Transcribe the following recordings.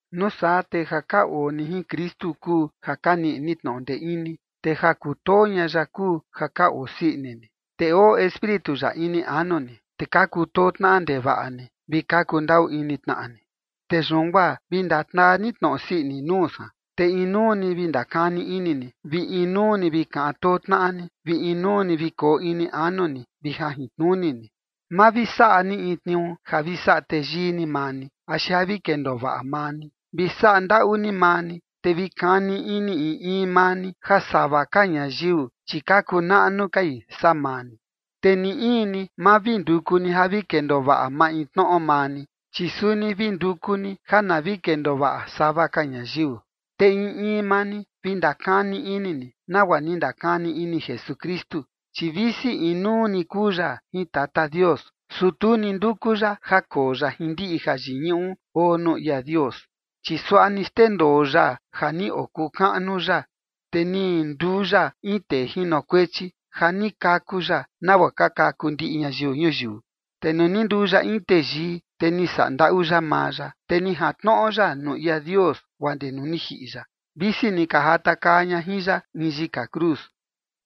Nuu saa te ja ka oo ni jin Kristu kuu ja ka niꞌi ni tnoꞌo ndee ini, te ja kutoo ña ya kuu ja ka oo sii ini ni, te oo Espíritu ya ini anu ni, te ka kutoo tnaꞌa ndevaꞌa ni vi ka kuu ndaꞌu ini tnaꞌa ni. Te yun guaa vi ndataa ni tnoꞌo sii ini nuu san, te inuu ni vi ndakani ini ni, vi inuu ni vi kaꞌan too tnaꞌa ni, vi inuu ni vi koo ini anu ni vi jajintnuni ni. Ma vi saꞌa ni in tniuu ja vi saꞌa teyii ni maa ni, axi ja vi kendoo vaꞌa maa ni. Vi saꞌa ndaꞌu ni maa ni, te vi kani ini in in maa ni ja sava ka ñayiu, chi ka kuu naꞌnu kai saa maa ni. Te ni in ni ma vi nduku ni ja vi kendoo vaꞌa maintnoꞌo maa ni, chi suni vi nduku ni ja na vi kendoo vaꞌa sava ka ñayiu. Te in in maa ni, vi ndakani ini ni nagua ni ndakani ini Jesukristu. Chi visi inuu ni kuu ya jin Tata Dios, su tu ni nduku ya ja koo ya jin ndiꞌi jayiñuꞌu oo nuu ia Dios. Chi suaꞌa ni xndendoo ya ja ni okuu kaꞌnu ya, te ni nduu ya in tee jinokuechi, ja ni kaku ya nagua ka kaku ndiꞌi ñayiu ñuyiu. Te nuu ni nduu ya in teyii, te ni saꞌa ndaꞌu ya maa ya, te ni jantnoꞌo ya nuu ia Dios guaa ndee nuu ni jiꞌi ya, visi ni ka jatakaa ña jin ya in yika cruz.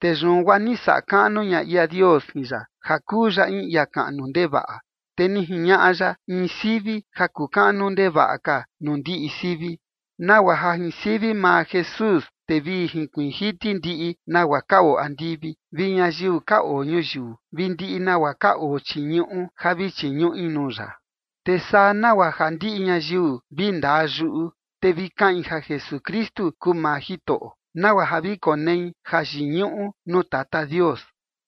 Te yun guaa ni saꞌa kaꞌnu ña ia Dios jin ya ja kuu ya in ia kaꞌnu ndevaꞌa. Te ni jiñaꞌa ya in sivi ja kuu kaꞌnu ndevaꞌa ka nuu ndiꞌi sivi. Nagua ja jin sivi maa Jesús, te vi jinkuiin jiti ndiꞌi nagua ka oo andivi, vi ñayiu ka oo ñuyiu, vi ndiꞌi nagua ka oo chii ñuꞌu ja vi chiñuꞌi nuu ya. Te saa nagua ja ndiꞌi ñayiu vi ndaa yuꞌu, te vi kaꞌin ja Jesukristu kuu maa Jitoꞌo, nagua ja vi konei jayiñuꞌu nuu Tata Dios.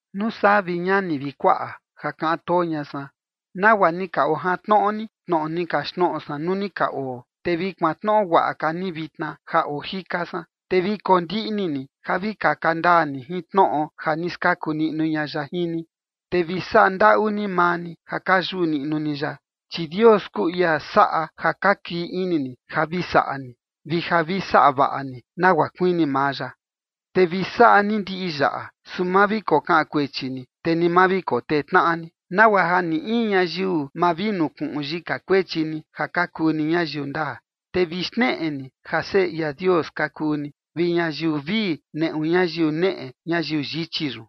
Nuu saa, vi ñani vi kuaꞌa ja kaꞌan too ña san, nagua ni ka ojantnoꞌo ni tnoꞌo ni kaxtnoꞌo san nuu ni ka oo, te vi kuantnoꞌo guaꞌa ka ni vitna ja oo jika san, te vi kondiꞌni ni ja vi kaka ndaa ni jin tnoꞌo ja ni skaku niꞌnu ña ya jin ni, te vi saꞌa ndaꞌu ni maa ni ja ka yuꞌu niꞌnu ni ya. Chi Dios kuu ia saꞌa ja ka kii ini ni ja vi saꞌa ni, vi ja vi saꞌa vaꞌa ni nagua kuini maa ya. Te vi saꞌa ni ndiꞌi yaꞌa, su ma vi kokaꞌan kuechi ni, te ni ma vi kotee tnaꞌa ni, nagua ja ni in ñayiu ma vi nukuꞌun yika kuechi ni ja ka kuu ni ñayiu ndaa, te vi xneꞌe ni ja seꞌe ia Dios ka kuu ni, vi ñayiu vii neꞌu ñayiu neꞌe ñayiu yichi yun.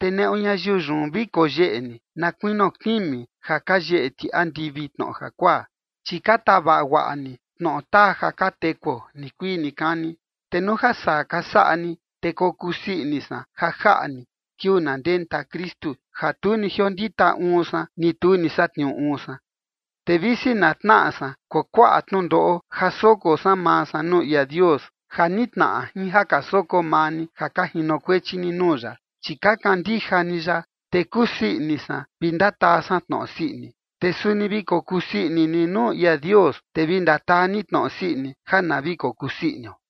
Te neꞌu ñayiu yun vi koyeꞌe ni na kuinio kimi ja ka yeꞌe ti andivi tnoꞌo jakuaa, chi ka tavaꞌa guaꞌa ni tnoꞌo taa ja ka tekuo nikuii nikani. Te nuu ja saa ka saꞌa ni, te kokusii ini san ja jaꞌa ni kiuu na ndenta Kristu ja tu ni jiondita uun san, ni tu ni satniuu uun san. Te visi na tnaꞌa san kuakuaꞌa tnundoꞌo ja soko san maa san nuu ia Dios, ja nitnaꞌa jin ja ka soko maa ni ja ka jinokuechi ni nuu ya, chi ka kandija ni ya, te kusii ini san vi ndataa san tnoꞌo sii ini. Te suni vi kokusii ini ni nuu ia Dios, te vi ndataa ni tnoꞌo sii ini ja na vi kokusii inio.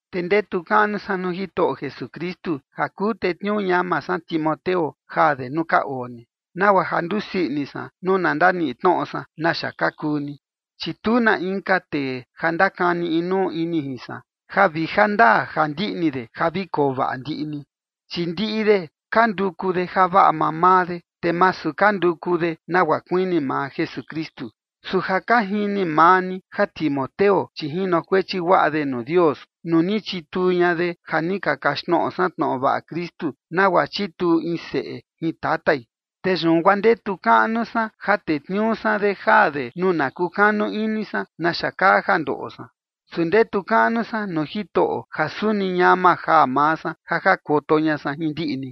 Te ndetu kaꞌnu san nuu Jitoꞌo Jesukristu ja kuu tetniuu ñama san Timoteo jaa de nuu ka oo ni, nagua ja ndusii ini san nuu na ndaniꞌi tnoꞌo san naxa ka kuu ni. Chi tu na inka tee ja ndakani inuu ini jin san, ja vi ja ndaa ja ndiꞌni de ja vi koo vaꞌa ndiꞌi ni. Chi ndiꞌi de ka nduku de javaꞌa mamaa de, te masu ka nduku de nagua kuini maa Jesukristu. Su ja ka jini maa ni ja Timoteo, chi jinokuechi guaꞌa de nuu Dios nuu ni chituu ña de ja ni ka kaxtnoꞌo san tnoꞌo vaꞌa Kristu, nagua chituu in seꞌe jin tatai. Te yun guaa ndetu kaꞌnu san ja tetniuu san de jaa de nuu na kukanu ini san naxa kaa ja ndoꞌo san. Su ndetu kaꞌnu san nuu Jitoꞌo ja suni ñama jaa maa san ja jakoto ña san jin ndiꞌi ni.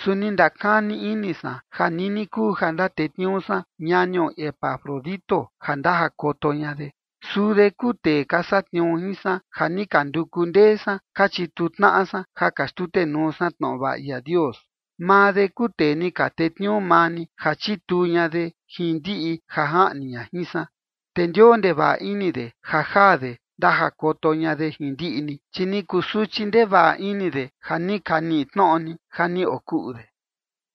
Su ni ndakani ini san ja nini kuu ja ndatetniuu san ñanio Epafrodito ja ndajakoto ña de. Suu de kuu tee ka satniuu jin san ja ni ka nduku ndee san ka chituu tnaꞌa san ja ka xtutenuu san tnoꞌo vaꞌa ia Dios. Maa de kuu tee ni ka tetniuu maa ni ja chituu ña de jin ndiꞌi ja jaꞌni ña jin san. Te ndioo ndevaꞌa ini de ja jaa de ndajakoto ña de jin ndiꞌi ni. Chi ni kusuchi ndevaꞌa ini de ja ni ka niꞌi tnoꞌo ni ja ni okuꞌu de.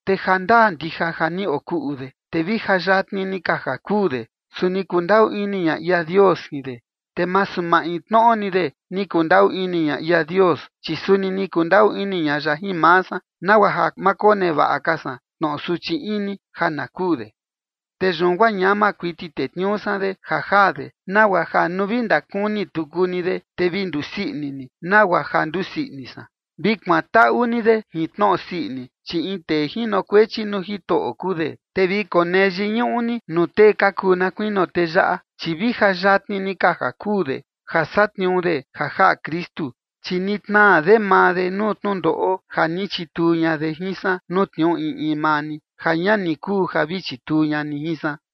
Te ja ndaa ndija ja ni okuꞌu de, te vi ja yatni ni ka ja kuu de, su ni kundaꞌu ini ña ia Dios jin de. Te masu maintnoꞌo ni de ni kundaꞌu ini ña ia Dios, chi suni ni kundaꞌu ini ña ya jin maa san, nagua ja ma konevaꞌa ka san tnoꞌo suchi ini ja na kuu de. Te yun guaa ñama kuiti tetniuu san de ja jaa de, nagua ja nuu vi ndakuni tuku ni de, te vi ndusii ini ni, nagua ja ndusii ini san. Vi kuantaꞌu ni de jin tnoꞌo sii ini, chi in tee jinokuechi nuu Jitoꞌo kuu de, te vi konee yiñuꞌu ni nuu tee ka kuu na kuinio tee yaꞌa, chi vi ja yatni ni ka ja kuu de ja satniuu de ja jaꞌa Kristu, chi ni tnaa de maa de nuu tnundoꞌo ja ni chituu ña de jin san nuu tniuu in in maa ni, ja ña ni kuu ja vi chituu ña ni jin san.